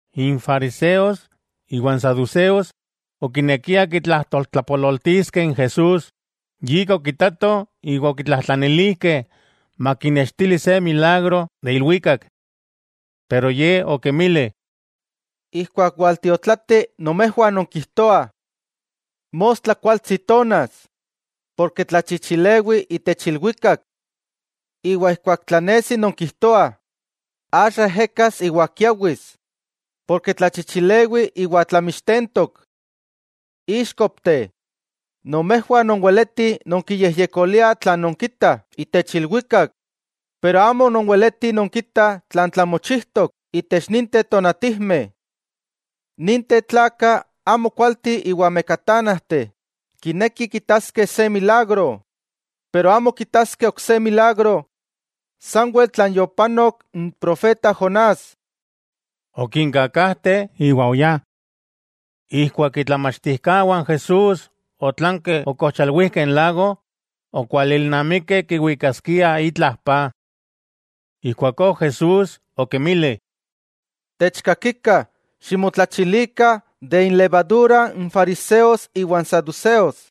N fariseos iwa n saduseos okinekiah kitlajtoltlapololtiskeh n Jesús, yika okitatoh iwa okitlajtlanilijkeh makinnextili se milagro de ilwikak. Pero Ye okinmili: —Ijkuak waltiotlati, nomejwah nonkijtoah: “Mostla kualtsi tonas ken tlachichilewi itech ilwikak”, iwa ijkuak tlanesi nonkijtoah: “Axa ejekas iwa kiawis, ken tlachichilewi iwa tlamixtentok.” ¡Íxkopteh! Nomejwah nonweletih nonkiyejyekoliah tlan nonkitah itech ilwikak, pero amo nonweletih nonkitah tlan tlamochijtok itech ninteh tonatijmeh. Ninteh tlakah amo kualteh iwa mekatánajteh kinekih kitaskeh se milagro, pero amo kitaskeh ok se milagro, sanwel tlan yopanok n profeta Jonás. Okinkakajte iwa oyá. Ijkuak itlamachtijkawah n Jesús otlankeh okojchalwijkeh n lago, okualilnamikeh kiwikaskiah itla paj. Ijkuakó Jesús okinmili: —Techkakikah, ximotlachilikah de inlevadura n fariseos iwa n saduseos.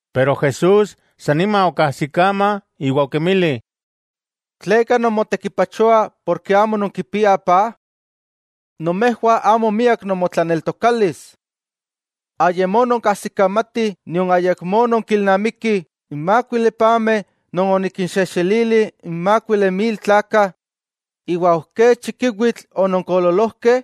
Pero Jesús san nima okajsikama iwa okinmili: —¿Tleka nomechtekipachoah amo nonkipiah paj? ¡Nomejwah amo miak nomotlaneltokalis! ¿Ayamó nonkajsikamatih nion ayakmó nonkilnamikih n mákuili pameh non onikinxejxelili n mákuili mil tlakah, iwa ok kech chikiwitl ononkoololojkeh?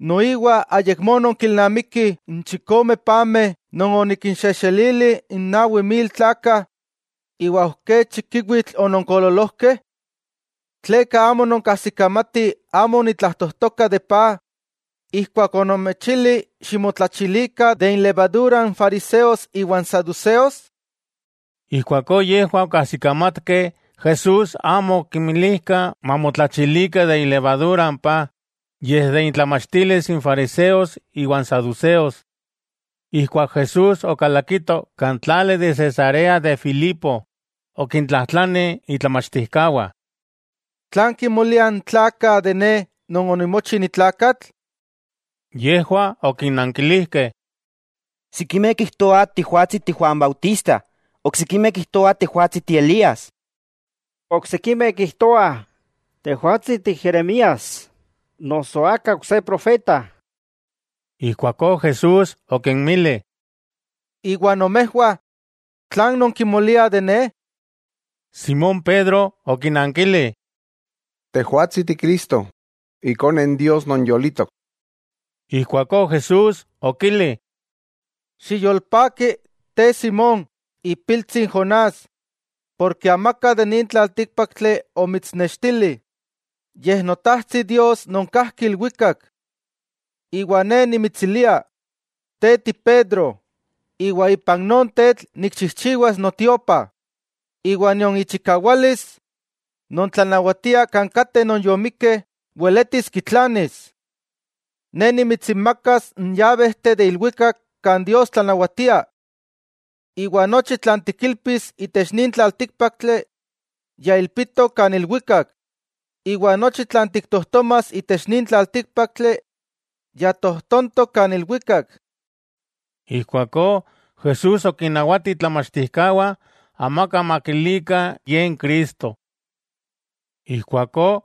¿Noiwa ayakmó nonkilnamikih n chikome pameh non onikinxejxelili n nawi mil tlakah, iwa ok kech chikiwitl ononkoololojkeh? ¿Tleka amo nonkajsikamatih amo onitlajtojtoka de paj, ijkuak onomechili ximotlachilikah de inlevadura n fariseos iwa n saduseos? Ijkuakó yejwah okajsikamatkeh Jesús amo okinmilijka mamotlachilikah de ilevadura n paj, yej de intlamachtilis n fariseos iwa n saduseos. Ijkuak Jesús okalakito kan tlali de Cesarea de Filipo, okintlajtlani itlamachtijkawah: —¿Tlan kimoliah n tlakah de Ne Non onimochi ni tlakatl? Yejwah okinankilijkeh: —Sikimeh kijtoah Tejwatsi ti Juan Bautista, oksikimeh kijtoah Tejwatsi ti Elías, iwa oksikimeh kijtoah Tejwatsi ti Jeremías noso aka ok se profeta. Ijkuakó Jesús okinmili: —Iwa nomejwah, ¿tlan non kimoliah, Akin Ne? Simón Pedro okinankili: —Tejwatsi Ti Cristo, Ikone Dios non yolitok. Ijkuakó Jesús okili: —Xiyolpaki te, Simón, ipiltsi Jonás, porke amaka de nin tlaltíkpaktli omitsnextili, yej Notajtsi Dios non kajki ilwikak. Iwa Ne nimitsilia, te ti Pedro, iwa ipan non tetl nikchijchiwas notiopa, iwa nion ichikawalis non tlanawatia kan kateh non yomikkeh weletis kitlanis. Ne nimitsinmakas n yabejteh de ilwikak kan Dios tlanawatia. Iwa nochi tlan tikilpis itech nin tlaltíkpaktli ya ilpitok kan ilwikak, iwa nochi tlan tiktojtomas itech nin tlaltíkpaktli, ya tojtontok kan ilwikak. Ijkuakó Jesús okinnawati itlamachtijkawah amaka makilikah Ye n Cristo. Ijkuakó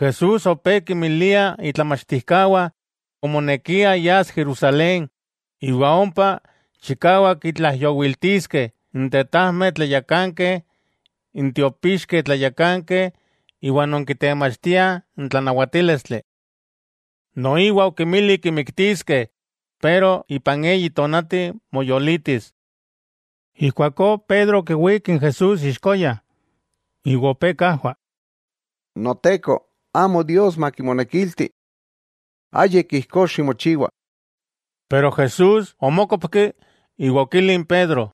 Jesús opé kinmilia itlamachtijkawah omonekia yas Jerusalén, iwa ompa chikawak kitlaijyowiltiskeh n tetajmeh tlayakankeh n tiopixkeh tlayakankeh iwa non kitemachtiah n tlanawatílistli. Noiwa okinmili kimiktiskeh, pero ipan eyi tonati moyolitis. Ijkuakó Pedro okiwík n Jesús ixkoya, iwa opé kajwa: —¡Noteko, amo Dios makimonekilti! ¡Ayik ijkó ximochiwa! Pero Jesús omókopki iwa okili n Pedro: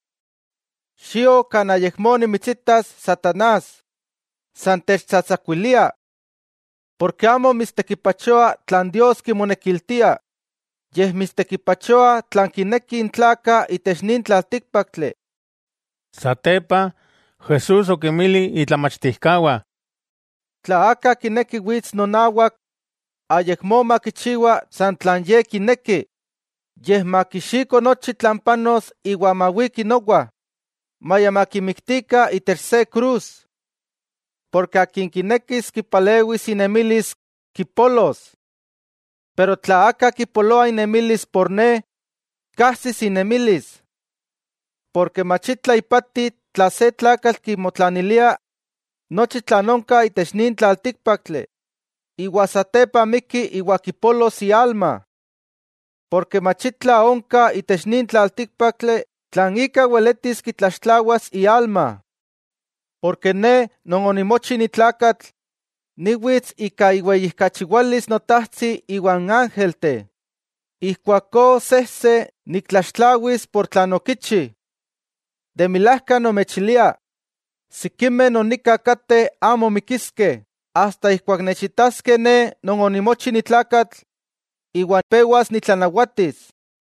—¡Xio kan ayakmó nimitsitas, satanás! ¡San techtsatsakuilia! Porke amo mitstekipachoa tlan Dios kimonekiltia, yej mitstekipachoa tlan kinekih n tlakah itech nin tlaltíkpaktli. Satepa Jesús okinmili itlamachtijkawah: —Tla aka kineki wits nonawak, ayakmó makichiwa san tlan ye kineki. Yej, makixiko nochi tlan panos iwa mawiki nowa, maya makimiktikah itech se krus. Porke akin kinekis kipalewis inemilis, kipolos. Tla aka kipoloa inemilis por ne, kajsis inemilis. Porke mach itla ipati tla se tlakatl kimotlanilia nochi tlan onka itech nin tlaltíkpaktli, iwa satepa mikki iwa kipolos ialma. Porke mach itla onka itech nin tlaltíkpaktli tlan ika weletis kitlaxtlawas ialma. Porke Ne Non onimochi ni tlakatl niwits ika iweyijkachiwalis Notajtsi iwa n ángelteh, ijkuakó sejse niktlaxtlawis ika tlan okichi. De milajka nomechilia, sikimeh non nika kateh amo mikiskeh asta ijkuak nechitaskeh Ne Non onimochi ni tlakatl, iwa pewas nitlanawatis.